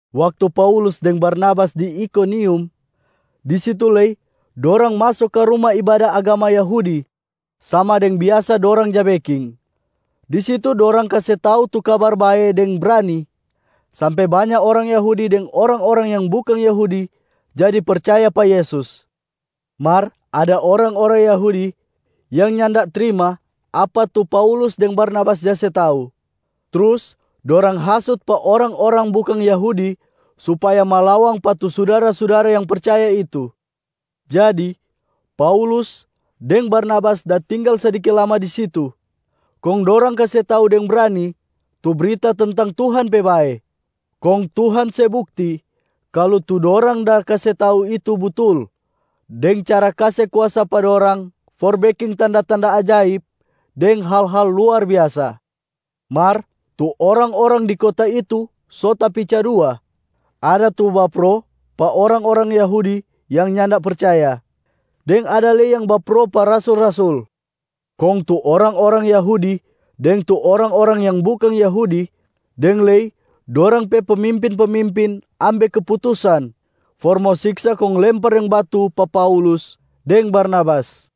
Waktu Paulus deng Barnabas di Ikonium, di situ lei dorang maso ka ruma ibada agama Yahudi sama deng biasa dorang ja beking. Di situ dorang kase tau tu Kabar Bae deng brani, sampe banya orang Yahudi deng orang-orang yang bukang Yahudi jadi percaya pa Yesus. Mar ada orang-orang Yahudi yang nyanda trima apa tu Paulus deng Barnabas ja se tau, trus dorang hasut pa orang-orang bukang Yahudi supaya malawang pa tu sudara-sudara yang percaya itu. Jadi Paulus deng Barnabas da tinggal sadiki lama di situ, kong dorang kase tau deng brani tu brita tentang Tuhan pe bae. Kong Tuhan se bukti kalu tu dorang da kase tau itu butul deng cara kase kuasa pa dorang for beking tanda-tanda ajaib deng hal-hal luar biasa. Mar tu orang-orang di kota itu so tapica dua. Ada tu bapro pa orang-orang Yahudi yang nyanda percaya, deng ada lei yang bapro pa rasul-rasul. Kong tu orang-orang Yahudi deng tu orang-orang yang bukang Yahudi deng lei dorang pe pemimpin-pemimpin ambe keputusan for mo siksa kong lempar deng batu pa Paulus deng Barnabas.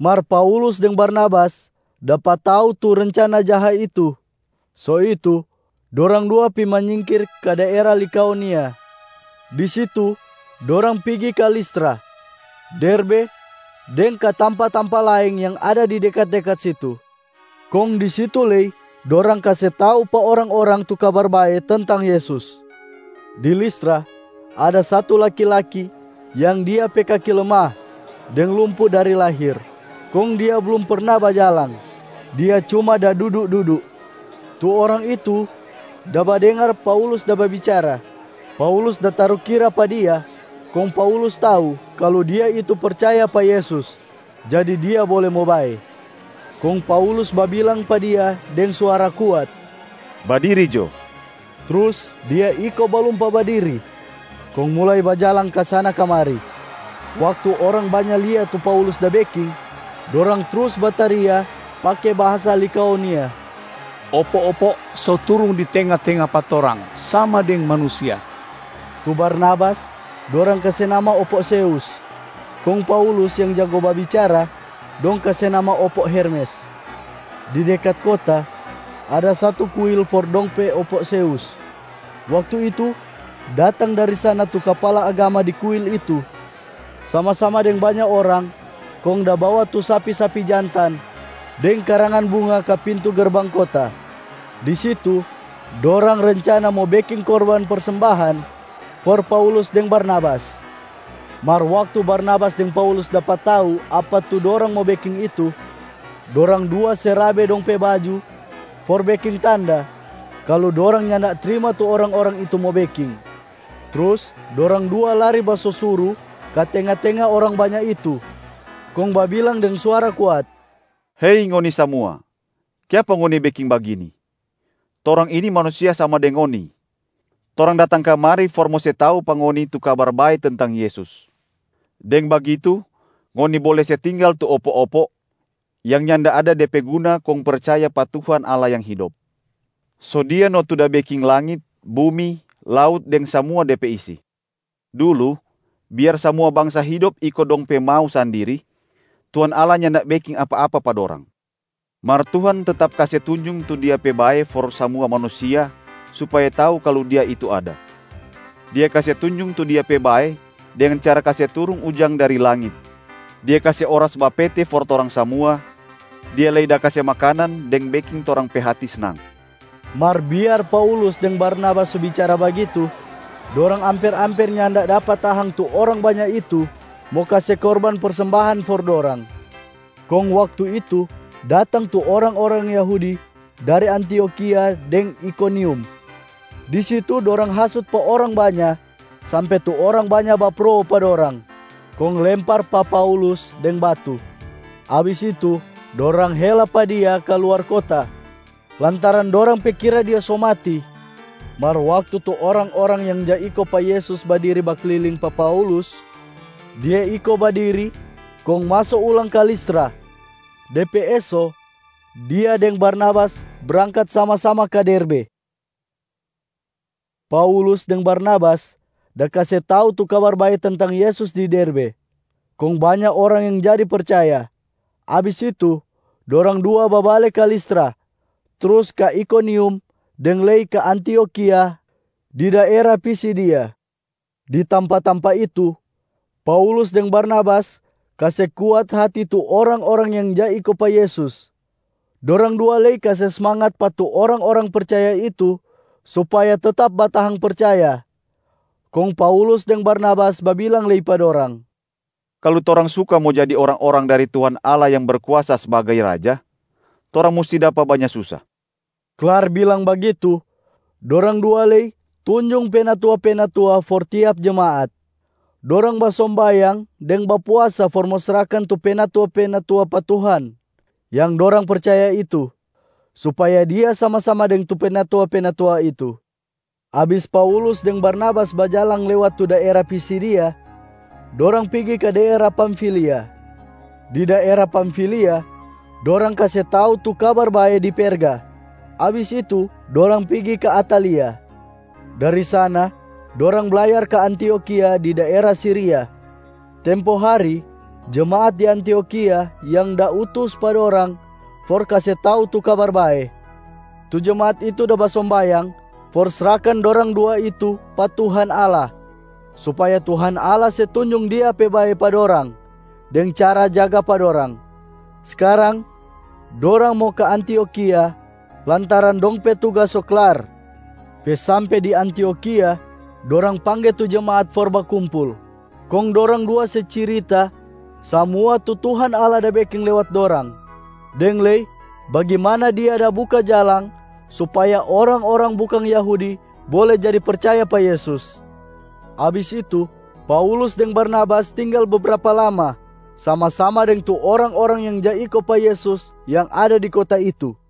Mar Paulus deng Barnabas dapa tau tu rencana jaha itu, so itu dorang dua pi manyingkir ka daera Likaonia. Di situ dorang pigi ka Listra, Derbe deng ka tampa-tampa laeng yang ada di dekat-dekat situ. Kong di situ lei dorang kase tau pa orang-orang tu Kabar Bae tentang Yesus. Di Listra, ada satu laki-laki yang dia pe kaki lemah deng lumpu dari dia lahir. Kong dia blum perna bajalang, dia cuma da dudu-dudu. Tu orang itu da badengar Paulus da babicara. Paulus da tarukira pa dia, kong Paulus tau kalu dia itu percaya pa Yesus, jadi dia bole mo bae. Kong Paulus babilang pa dia deng suara kuat, “Badiri jo!” Trus dia iko balumpa badiri, kong mulai bajalang kasana-kamari. Waktu orang banya lia tu Paulus da beking, dorang trus bataria pake bahasa Likaonia, “Opo-opo so turung di tenga-tenga pa torang sama deng manusia!” Tu Barnabas dorang kase nama ‘opo Zeus’, kong Paulus yang jago babicara dong kase nama ‘opo Hermes’. Di dekat kota, ada satu kuil for dong pe opo Zeus. Waktu itu datang dari sana tu kapala agama di kuil itu sama-sama deng banya orang kong da bawa tu sapi-sapi jantan deng karangan bunga ka pintu gerbang kota. Di situ dorang rencana mo beking korban persembahan for Paulus deng Barnabas. Mar waktu Barnabas deng Paulus dapa tau apa tu dorang mo beking itu, dorang dua se rabe dong pe baju for beking tanda kalu dorang nyanda trima tu orang-orang itu mo beking. Trus dorang dua lari basosuru ka tenga-tenga orang banya itu kong babilang deng suara kuat, “Hei ngoni samua, kiapa ngoni beking bagini? Torang ini manusia sama deng ngoni. Torang datang kamari for mo se tau pa ngoni tu Kabar Bae tentang Yesus. Deng bagitu ngoni bole se tinggal tu opo-opo yang nyanda ada de pe guna kong percaya pa Tuhan Allah yang hidop. So Dia no tu da beking langit, bumi, laut deng samua de pe isi. Dulu, biar samua bangsa hidop iko dong pe mau sandiri, Tuhan Allah nyanda beking apa-apa pa dorang. Mar Tuhan tetap kase tunjung tu Dia pe bae for samua manusia supaya tau kalu Dia itu ada. Dia kase tunjung tu Dia pe bae deng cara se turung ujang dari langit, Dia kase oras bapete for torang samua, Dia lei da kase makanan deng beking torang pe hati snang.” Mar biar Paulus deng Barnabas so bicara bagitu, dorang amper-amper nyanda dapa tahang tu orang banya itu mo kase korban persembahan for dorang. Kong waktu itu datang tu orang-orang Yahudi dari Antiokhia deng Ikonium. Di situ, dorang hasut pa orang banya sampe tu orang banya bapro pa dorang kong lempar pa Paulus deng batu. Abis itu dorang hela pa dia ka luar kota, lantaran dorang pe kira dia so mati. Mar waktu tu orang-orang yang ja iko pa Yesus badiri bakliling pa Paulus, dia iko badiri kong maso ulang ka Listra. De pe eso, dia deng Barnabas brangkat sama-sama ka Derbe. Paulus deng Barnabas da kase tau tu Kabar Bae tentang Yesus di Derbe, kong banya orang yang jadi percaya. Abis itu, dorang dua babale ka Listra, trus ka Ikonium deng lei ka Antiokhia di daera Pisidia. Di tampa-tampa itu, Paulus deng Barnabas kase kuat hati tu orang-orang yang ja iko pa Yesus. Dorang dua lei kase smangat pa tu orang-orang percaya itu supaya tetap batahang percaya. Kong Paulus deng Barnabas babilang lei pa dorang, “Kalu torang suka mo jadi orang-orang dari Tuhan Allah yang Berkuasa sbagai Raja, torang musti dapa banya susa.” Klar bilang bagitu, dorang dua lei tunjung penatua-penatua for tiap jemaat. Dorang basombayang deng bapuasa for mo srahkan tu penatua-penatua pa Tuhan yang dorang percaya itu, supaya Dia sama-sama deng tu penatua-penatua itu. Abis Paulus deng Barnabas bajalang lewat tu daera Pisidia, dorang pigi ka daera Pamfilia. Di daera Pamfilia, dorang kase tau tu Kabar Bae di Perga. Abis itu dorang pigi ka Atalia. Dari sana dorang blayar ka Antiokhia di daera Siria. Tempo hari, jemaat di Antiokhia yang da utus pa dorang for kase tau tu Kabar Bae. Tu jemaat itu da basombayang for srahkan dorang dua itu pa Tuhan Allah supaya Tuhan Allah se tunjung Dia pe bae pa dorang deng cara jaga pa dorang. Skarang dorang mo ka Antiokhia lantaran dong pe tugas so klar. Pe sampe di Antiokhia, dorang pangge tu jemaat for bakumpul. Kong dorang dua se cirita samua tu Tuhan Allah da beking lewat dorang, deng lei bagimana Dia da buka jalang supaya orang-orang bukang Yahudi bole jadi percaya pa Yesus. Abis itu, Paulus deng Barnabas tinggal bebrapa lama sama-sama deng tu orang-orang yang ja iko pa Yesus yang ada di kota itu.